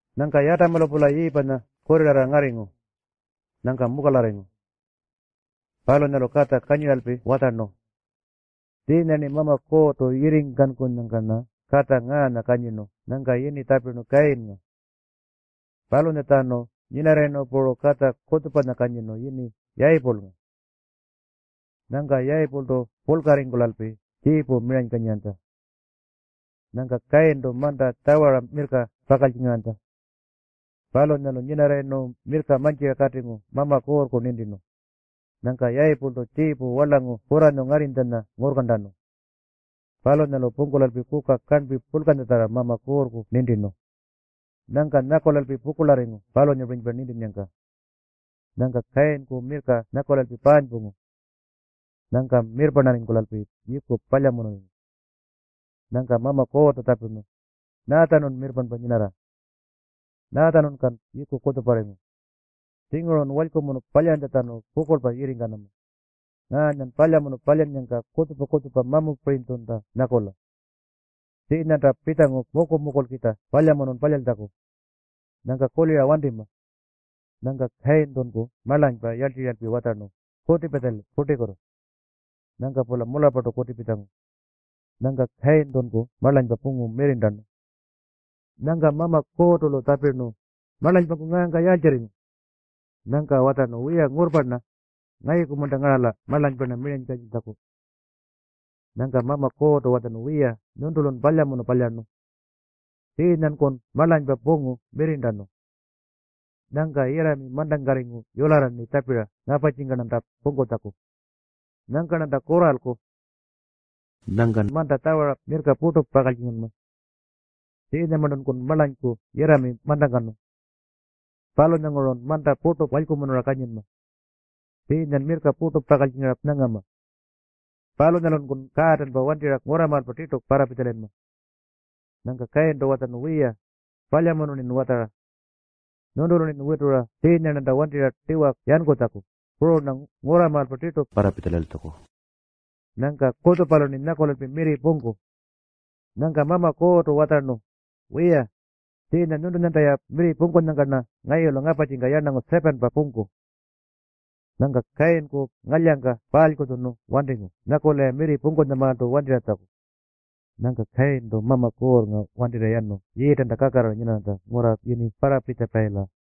Nyangka Yatamanya-pula Yiipanya kurrirarra ngarringu. Nyangka mukalarringu. Palunyalu katja kanyiralpi watjarnu, “Tjiinya-rni Mama Kuurrtu yirringkankunyangka-rna katja ngaanya kanyirnu.” Nyangka yini tjapirnu Kayinnga. Palunyatjanu nyinarrayirnu puru katja kutjupanya kanyirnu yini Yayipulnga. Nyangka Yayipultu purlkarringkulalpi tjiipu miranykanyiranytja. Nyangka Kayintu manta tjawara mirrka pakaltjingaranytja. Palunyalu nyinarrayirnu mirrka mantjira katingu Mama Kuurrku nintirnu. Nyangka Yayipultu tjiipu warlangu kurranyu ngarrinytjanya ngurrkarntanu. Palunyalu pungkulalpi kuka karnpi purlkanyatjarra Mama Kuurrku nintirnu. Nyangka nyakulalpi pukurlarringu palunyapirinypa nintinnyangka. Palunyalu Kayinku mirrka nyakulalpi paanypungu. Nyangka mirrparnarringkulalpi yiiku palyamunurringu. Nyangka Mama Kuurrtu tjapirnu, “Nyaatjanun mirrparnpa nyinarra? Nyaatjanungkan yiiku kutjuparringu? Tjingurun walykumunu palyantjatjanu pukurlpa yikarringama. Ngaanyan palyamunu palyannyangka kutjupa-kutjupa mamupirinytjunta nyakula. Tjiinyanta pitjangu muku-mukulkitja palyamunun palyaltjaku. Nyangka kulira wantima.” Nyangka Kayintunku marlanypa yarltirralpi watjarnu, “Kutipitja-li purtikutu.” Nyangka-pula mularrpartu kutipitjangu. Nyangka Kayintunku marlanypa pungu mirrirntanu. Nyangka Mama Kuurrtu-lu tjapirnu, “Marlanypanku ngaangka yaaltjirringu?” Nyangka watjarnu, “Wiya, ngurrpa-rna. Ngayuku-munta ngarala marlanypa-rna miranykanyiltjaku?” Nyangka Mama Kuurrtu watjarnu, “Wiya, nyuntulun palyamunu palyarnu. Tjiinyankun marlanypa pungu mirrirntanu. Nyangka yirrami mantangkarringu yularra-rni tjapira ngaparrtjika-rnanta pungkutjaku. Nyangka-rnanta kurralku. Nyangkan manta tjawara mirrka purtu pakaltjinganma. Tjiinyamarntunkun marlanyku yirrami mantangkanu. Palunyangurun manta purtu walykumunura kanyinma. Tjiinyan mirrka purtu pakaltjingara nyangama. Palunyatjanunkun kaatanpa wantirra ngurramaalpa tirtu parrapitjalayinma.” Nyangka Kayintu watjarnu, “Wiya, palyamunu-rnin watjara. Nyuntulu-rnin witura tjiinya-rnanta wantirra tiwa yankutjaku, puru-rna ngurramaalpa tirtu parrapitjalayiltjaku. Nyangka kutjupalu-rni nyakulalpi mirri pungku.” Nyangka Mama Kuurrtu watjarnu, “Wiya, tjiinya nyuntunyanta-ya mirri pungkunyangka-rna ngayulu ngaparrtjika yarnangu 7-pa pungku.” Nyangka Kayinku ngalyangka parlkuntjunu wantingu nyakula-ya mirri pungkutjamaaltu wantirratjaku. Nyangka Kayintu Mama Kuurrnga wantirra yanu Yiitanta kakarrara nyinarranytja ngurra yini Parrapitjapayila.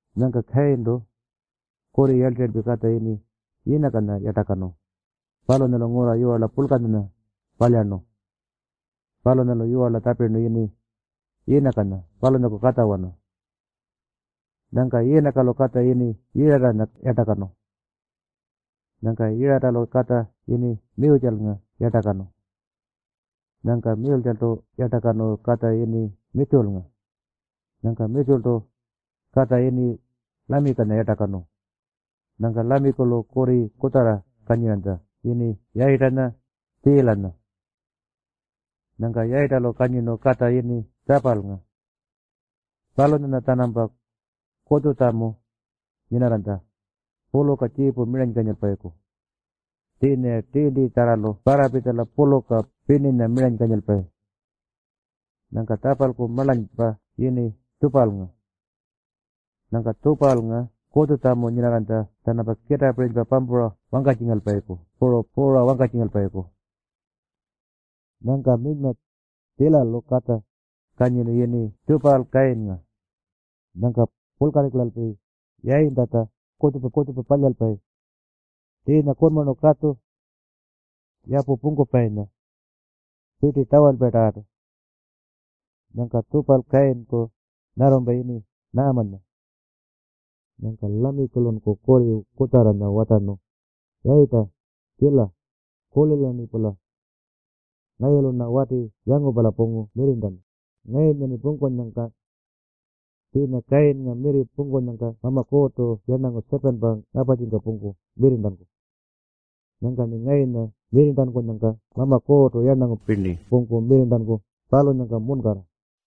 Nyangka Kayintu kurri yarltirralpi katja yini Yiinakanya yartakanu. Palunyalu ngurra yiwarla purlkanya palyarnu. Palunyalu yiwarla tjapirnu yini Yiinakanya palunyaku katjawana. Nyangka Yiinakalu katja yini Yiratanya yartakanu. Nyangka Yiratalu katja yini Miyutjalnga yartakanu. Nyangka Miyutjaltu yartakanu katja yini Mitjutjalnga. Nyangka Mitjutjaltu katja yini Lamikinya yartakanu. Nyangka Lamikilu kurri kutjarra kanyiranytja yini Yayitanya, Tjiilanya. Nyangka Yayitalu kanyirnu katja yini Tjapalnga. Palunyanya-tjanampa kutjutjamu nyinarranytja puluka tjiipu miranykanyilpayiku. Tjiinya-ya tiintitjarralu parrapitjala puluka pirninya miranykanyilpayi. Nyangka Tjapalku marlanypa yini Tjupalnga. Nyangka Tjupalnga kutjutjamu nyinarranytja-tjanampa kitaapirinypa pampura wangkatjingalpayiku puru puura wangkatjingalpayiku. Nyangka minyma Tjiilalu katja kanyirnu yini Tjupal-Kayinnga. Nyangka purlkarringkulalpi yayintatja kutjupa-kutjupa palyalpayi: tjiinya kunmarnu, katju, yapu pungkupayinya, pirti tjawalpayinyatarrartu. Nyangka Tjupal-Kayinku nyarrumpa yini Naamanya. Nyangka Lamikilunku kurri kutjarranya watjarnu, “Yayita, Tjiila, kulila-rnipula. Ngayulu-rna wati yangupala pungu mirrirntanu ngayunya-rni pungkunyangka. Tjiinya Kayinnga mirri pungkunyangka Mama Kuurrtu yarnangu 7-pa ngaparrtjika pungku mirrirntanku. Nyangka-rni ngayunya mirrirntankunyangka Mama Kuurrtu yarnangu pirni pungku mirrirntanku palunyangka munkarra.”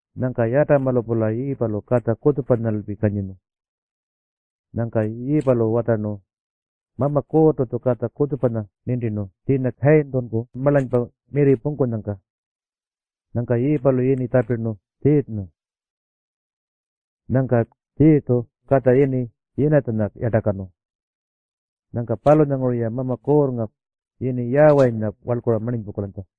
Nyangka Yatamalu-pula Yiipalu katja kutjupanyalpi kanyirnu. Nyangka Yiipalu watjarnu, “Mama Kuurrtu-tju katja kutjupanya nintirnu tjiinya Kayintunku marlanypa mirri pungkunyangka.” Nyangka Yiipalu yini tjapirnu Tjiirrnga. Nyangka Tjiirrtu katja yini Yiinatjanya yartakanu. Nyangka palunyanguru-ya Mama Kuurrnga yini Yaawayinya warlkura marninypungkulanytja.